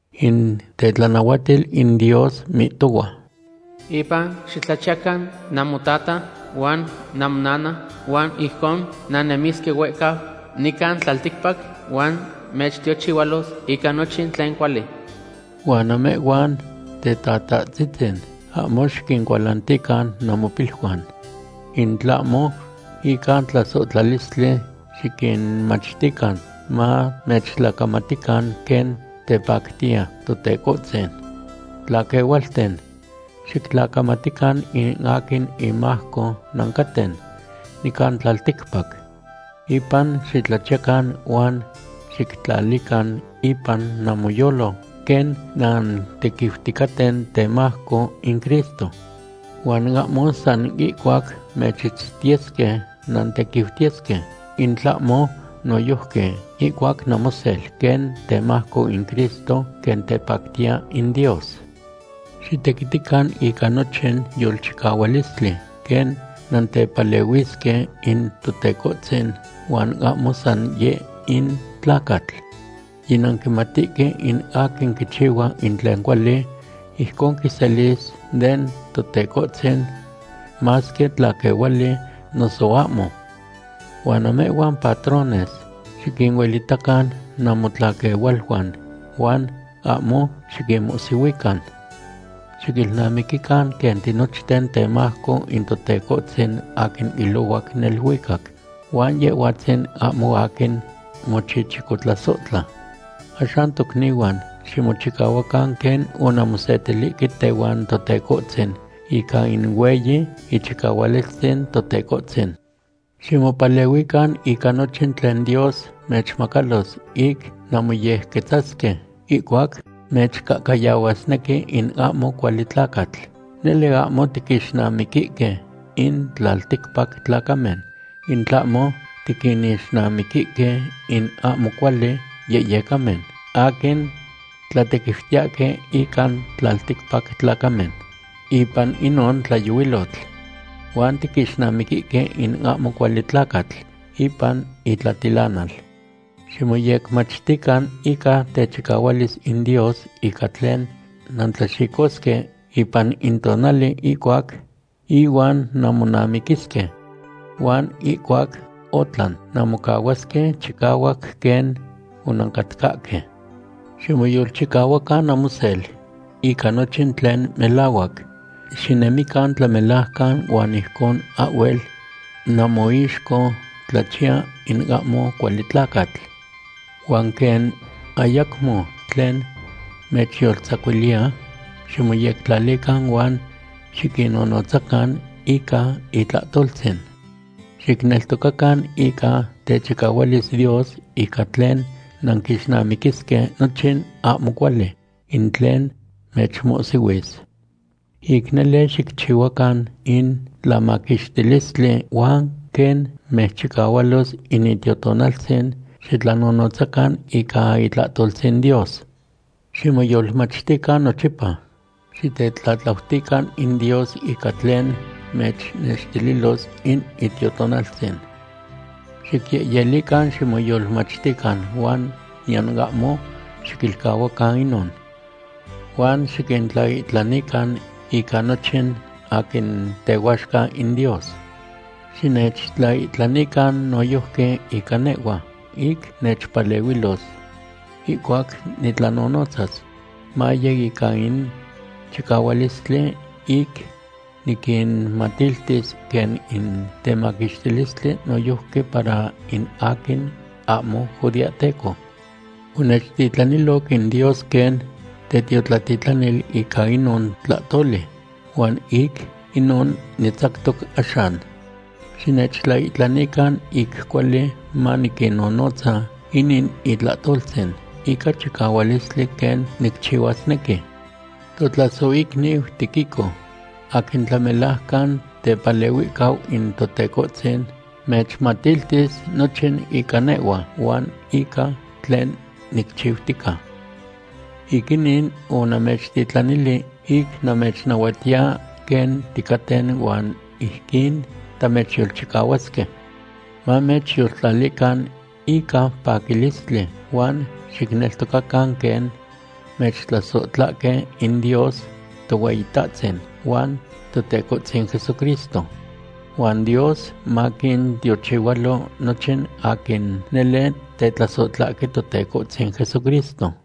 In tetlanahuatil in Dios mihtohua: “Impa xitlachiyacan namotata huan namonana, huan ijcon nannemisque huehcau nican tlalticpac huan mechtiochihualos ica nochin tlen cuali.” Huan namehhuan tetatahtzitzin, ahmo xiquincualantican namopiluan. In tlahmo ica tlasohtlalistli xiquinmachtican mamechtlacamatican, quen tepactiya Totecohtzin. Tlaquehualten, xictlacamatican in aquin inmajco nancaten nican tlalticpac. Impa xitlachiyacan huan xictlalican ipan namoyolo quen nantequiuticaten temajco in Cristo. Huan ahmo san ihcuac mechitztiyesque nantequiutiyesque, in tlahmo noyojqui ihcuac namosel, quen temajco in Cristo, quen tepactiya in Dios. Xitequitican ica nochin yolchicahualistli quen nantepalehuisque in Totecohtzin huan ahmo san yeh in tlacatl. Yinanquimatihque in aquin quichihua in tlen cuali, ijcon quiselis den Totecohtzin, masque tlaquehuali noso ahmo. Huan namehhuan patrones xiquinuelitacan namotlaquehualuan huan ahmo xiquinmohsihuican. Xiquilnamiquican quen tinochten temajco in Totecohtzin aquin ilohuac neluicac, huan Yehhuatzin ahmo aquin mochichicotlasohtla. Axan tocnihuan, ximochicahuacan quen onanmosetilihque tehuan Totecohtzin ica in hueyi ichicahualistzin Totecohtzin. Ximopalehuican ica nochin tlen Dios mechmacalos ic nanmoyequetzasque ihcuac mechcahcayahuasnequi in ahmo cuali tlacatl. Nele ahmo tiquinixnamiquihque in tlalticpac tlacamen, in tlahmo tiquinixnamiquihque in ahmo cuali yehyecamen aquin tlatequiutiyahque ican tlalticpac tlacamen ipan inon tlayohuilotl. Huan tiquixnamiquihque in ahmo cuali tlacatl ipan itlatilanal. Ximoyecmachtican ica techicahualis in Dios ica tlen nantlaxicosque ipan in tonali ihuac ihuan nanmonamiquisque. Huan ihcuac otlan, nanmocahuasque chicahuac quen onancatcahque. Ximoyolchicahuacan namosel ica nochin tlen melahuac. Xinemican tlamelajcan huan ijcon ahhuel namoixco tlachiya in ahmo cuali tlacatl. Huan quen ayacmo tlen mechyoltzacuiliya, ximoyectlalican huan xiquinnonotzacan ica itlahtoltzin. Xicneltocacan ica techicahualis Dios ica tlen nanquixnamiquisque nochin ahmo cuali in tlen mechmohsihuis. Ic nele xicchiyacan in tlamaquixtilistli, huan quen mechchicahualos in Itiotonaltzin, xictlanonotzacan ica itlahtoltzin Dios. Ximoyolmachtican nochipa. Xitetlatlautican in Dios ica tlen mechnextililos in Itiotonaltzin. Xicyehyelican ximoyolmachtican huan niyan ahmo xiquilcahuacan inon. Huan xiquintlaihtlanican ica nochin aquin tehuaxca in Dios. Xinechtlaihtlanican noyojqui ica nehhua, ic nechpalehuilos ihcuac nitlanonotzas, maye ica in chicahualistli ic niquinmatiltis quen in temaquixtilistli noyojqui para in aquin ahmo judeahteco. Onechtitlaniloc in Dios quen tetiotlatitlanil ica inon tlahtoli, huan ic inon nitzactoc axan. Xinechtlaihtlanican ic cuali maniquinnonotza inin itlahtoltzin ica chicahualistli quen nicchihuasnequi. Totlasohicniu Tíquico, aquin tlamelajcan tepalehuihcau in Totecohtzin, mechmatiltis nochin ica nehhua huan ica tlen nicchiutica. Ic inin onamechtitlanili ic namechnahuatiya quen ticaten huan ijquin tamechyolchicahuasque. Mamechyoltlalican ica paquilistli huan xicneltocacan quen mechtlasohtlahque in Dios Tohueyitahtzin huan Totecohtzin Jesucristo. Huan Dios maquintiochihualo nochin aquin nele tetlasohtlahque Totecohtzin Jesucristo.